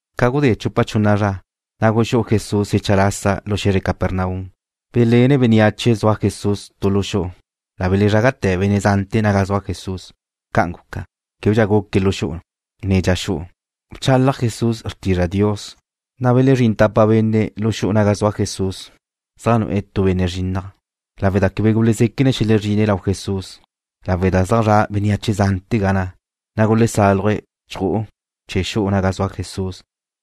Ca gudé chupa chunna zra, na' guxú'u Jesús xecha lasa lu xe̱zre Capernaum. Belénne bénneache zua Jesús tu lu xu'u. La belezrágate̱ benne' zante̱ naga zua Jesús. Ca'an guca, québedxa guque lu xu'u, ne dxa xu'u. Bchalaj Jesús xrtizra Dios. Na' belezrín tapa benne' lu xu'u naga zua Jesús, zaj nu'e̱ tu benne' quebe gaca se̱'e̱. Lawe' da quebe gulezéquene̱' xelezrine̱' lau Jesús, lawe' da zaj zra' bénneache zante̱ ga na', na' gulesáluje̱' chju'u chee̱ xu'u naga zua Jesús.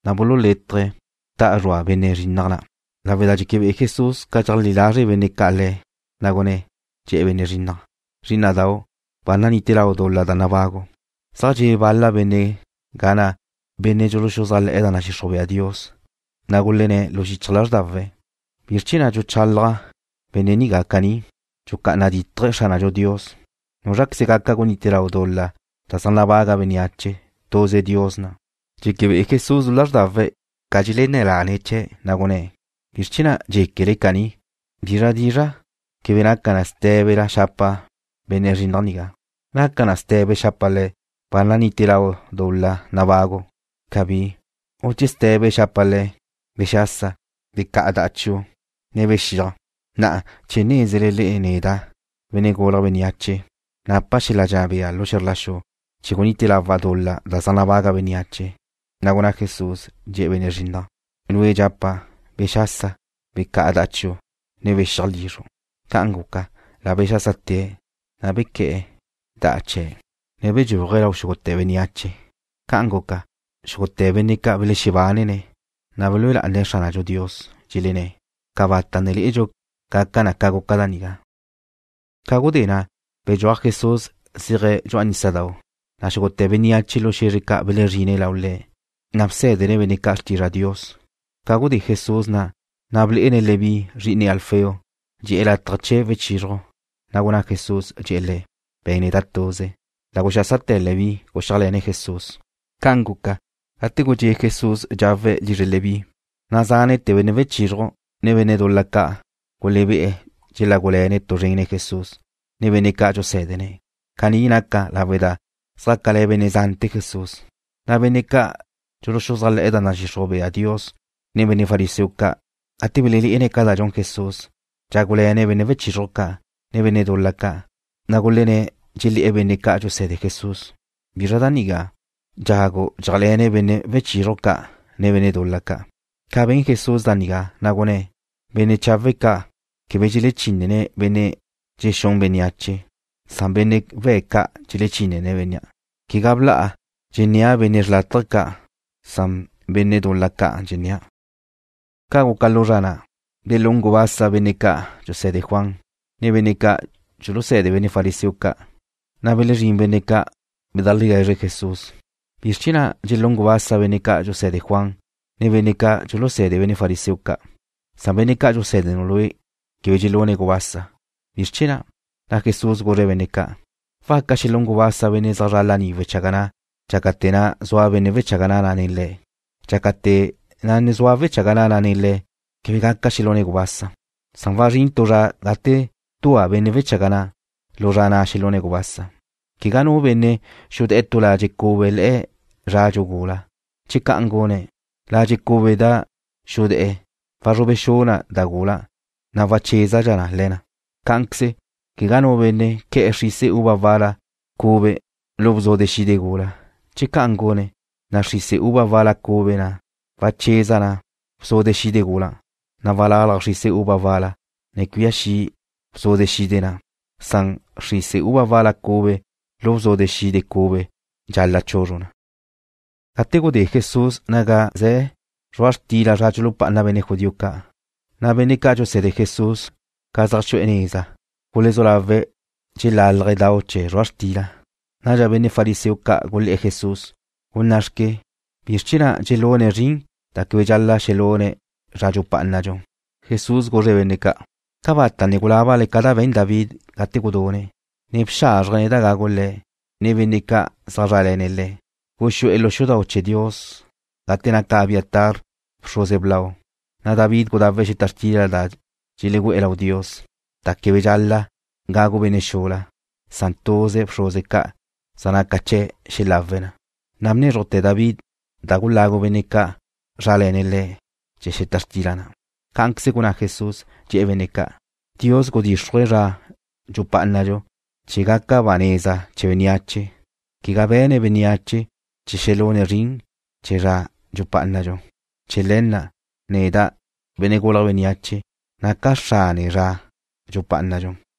Na' bululétaje̱' da'a da zrua benne' na' quebe gaca se̱'e̱. Lawe' da dxeque be'e Jesús ca dxeleajlí lazre' benne' ca' Le̱', na' gunné̱', dxe̱'e̱ bénnea' quebe gaca se̱'e̱: ―Zrí'ina'dau', ba nanite lau dul-la da nabagu'. Zaj dxe'e bal-la benne' ga na', benne' dxuluxuzájle̱'e̱ da nadxixruj bea Dios, na' gulenné̱ lanze̱': ―¿Bizr chee̱ na' dxuchalaj caní benne' nigá? Dxucá'ana dítaje̱' Xránadxu Dios. ¿Núzraqueze gaca gunite lau dul-la da zaj nabaga bénneache? Tuze Dios na'. Dxeque be'e Jesús lu lázrdawe̱' ca dxelenné̱ lane̱' chee̱', na' gunné̱': ―¿Bizr chee̱ na' dxéquele caní? ¿Bizra dizra' quebe naca na sté̱bela xapa' benne' nigá quebe gaca se̱'e̱? ¿Naca na ste̱be xapa' le̱', ba nanite lau dul-la nabagu'? Cabí. ¿U che ste̱be xapa' le̱', bexasa, becá'a da denu', ne bexíaj? Na'a, chee̱ nézele le'e neda', Benne' Gulje̱' Bénneache, napa' xel-la dxenná bea lu xe̱zr la xu gunite lawa' dul-la da zaj nabaga bénneache. Na' gunná Jesús, dxe̱'e̱ bénnea'. ―Lue' dxapa', bexasa, becá'a da'a chiu', ne bexíaj lizru'. Ca'an guca, la bexásate̱', na' bequé̱'e̱ da'a chee̱', ne bedxúaje̱' lau xúgute̱ bénneache. Ca'an guca, xúgute̱ benne' ca' belexebánene̱', na' belúe lá'ane̱' Xránadxu Dios. Dxelenné̱': ―Cabata' ne lé'edxu gaca na ca guca da nigá. Ca gudé na' bedxúaj Jesús zéaje̱' dxu'a nísadau', na' xúgute̱ bénneache lu xe̱zre ca' belezrine̱' lau Le̱'. Nadxa bsé̱dene̱' benne' ca' xrtizra Dios. Ca gudé Jesús na', ble'ene' Leví, zri'ine Alfeo, dxe'e̱ lataj chee̱ wechizruj. Na' gunná Jesús, dxe̱'e̱ le̱': ―Be̱n neda' tuze. La guxásate̱ Leví, guxíajle̱ne̱' Jesús. Ca' guca, gate gudxé' Jesús dxawe̱' lizre Leví, na' zánete̱ benne' wechizruj, ne benne' dul-la ca' gulebé'e̱ dxelágule̱ne̱' tu zren nen Jesús, ne benne' ca' dxusé̱dene̱'. Caní naca lawe' da zjácale̱ benne' zante̱ Jesús. Nadxa benne' ca' dxuluxuzájle̱'e̱ da nadxixruj bea Dios, ne benne' fariseo ca', gate belelé'ene̱' ca da dxun Jesús, dxágule̱ne̱' benne' wechizruj ca', ne benne' dul-la ca', na' gulenné̱', dxelé̱'e̱ benne' ca' dxuse̱de Jesús: ―¿Bizra da nigá? Dxagu dxé'ajle̱ne̱' benne' wechizruj ca', ne benne' dul-la ca'. Ca ben Jesús da nigá, gunné̱': ―Benne' chawe' ca' quebe dxelechínene̱' benne' dxexún bénneache. Benne' we̱' ca' dxelechínene̱' bénnea'. Quegá bla'a dxennéa' benne' xrlátaje ca'. Benne' dul-la ca' dxennéa'. Ca guca lu zra na', belún gubasa benne' ca' dxuse̱de Juan, ne benne' ca' dxuluse̱de benne' fariseo ca'. Na' belezrín benne' ca', bedajlegue̱zre̱' Jesús: ―¿Bizr chee̱ na' dxelún gubasa benne' ca' dxuse̱de Juan, ne benne' ca' dxuluse̱de benne' fariseo ca', na' benne' ca' dxusé̱denu' Lue' quebe dxelune̱' gubasa? ¿Bizr chee̱ na'? Na' Jesús guzre̱' benne' ca': ―¿Waca xelún gubasa benne' zaj zre̱'e̱ laní chee̱ wechaga na' dxácate̱ na' zua benne' wechaga na' nen le̱'? Dxácate̱ na' zua wechaga na' nen le̱' quebe gaca xelune̱' gubasa. Wazrín tu zra gate dua benne' wechaga na'. Lu zra na' xelune̱' gubasa. ’Quegá nu benne' xudé̱'e̱ tu ladxe' cube le̱'e̱ zradxu gula. Che ca'an gune̱', ladxe' cube da xudé̱'e̱ wazrube xu na da gula, na' wachézadxa na. Cá'anqueze, quegá nu benne' que̱'e̱ xrise uva wal-la cube lu bzude xide gula. Che ca'an gune̱', na' xrise uva wal-la cube na' wacheza na bzude xide gula, na' walalaj xrise uva wal-la, ne cuía xi bzude xide na'. Xrise uva wal-la cube lu bzude xide cube dxal-la' chuzruj na. Gate gudé Jesús naga ze̱ zrua' xtila zra dxulupá'ana benne' judío ca', ná'ate̱ na' benne' ca' dxuse̱de Jesús, ca zaj xu'e̱ neza, gulezú lawe̱' dxelíchaje̱' dau naga zria zrua' xtila. Nadxa benne' fariseo ca' gulé̱'e̱ Jesús: ―Gunná'xque. ¿Bizr chee̱ na' dxelune̱' zrin da quebe dxal-la' xelune̱' zra dxupá'anadxu? Jesús guzre̱' benne' ca': ―¿Cabata' ne gulábale ca da be̱n David gate gudune̱', ne bxázrjene̱' da gagu le̱', ne da gugawe̱' benne' ca' zaj zrále̱ne̱' le̱'? Guxú'e̱ lu xu'u chee̱ Dios gate naca Abiatar bxruze blau, na' David gudawe̱' xeta xtila da dxelu'e̱ lau Dios, da quebe dxal-la' gagu benne' xula, san tuze bxruze ca' zaj naca chee̱' xelawe̱' na. Na' bnézrujte̱ David da gulagu benne' ca' zrále̱ne̱' le̱' chee̱ xeta xtila na'. Cá'anqueze gunná Jesús, dxe̱'e̱ benne' ca': ―Dios gudíxruje̱' zra dxupá'anadxu chee̱ gaca ba neza chee̱ bénneache, quegá be̱ne̱' bénneache chee̱ xelune̱' zrin chee̱ zra dxupá'anadxu. Chee̱ le̱ na', neda', Benne' Gulje̱' Bénneache, naca' xrane zra dxupá'anadxu.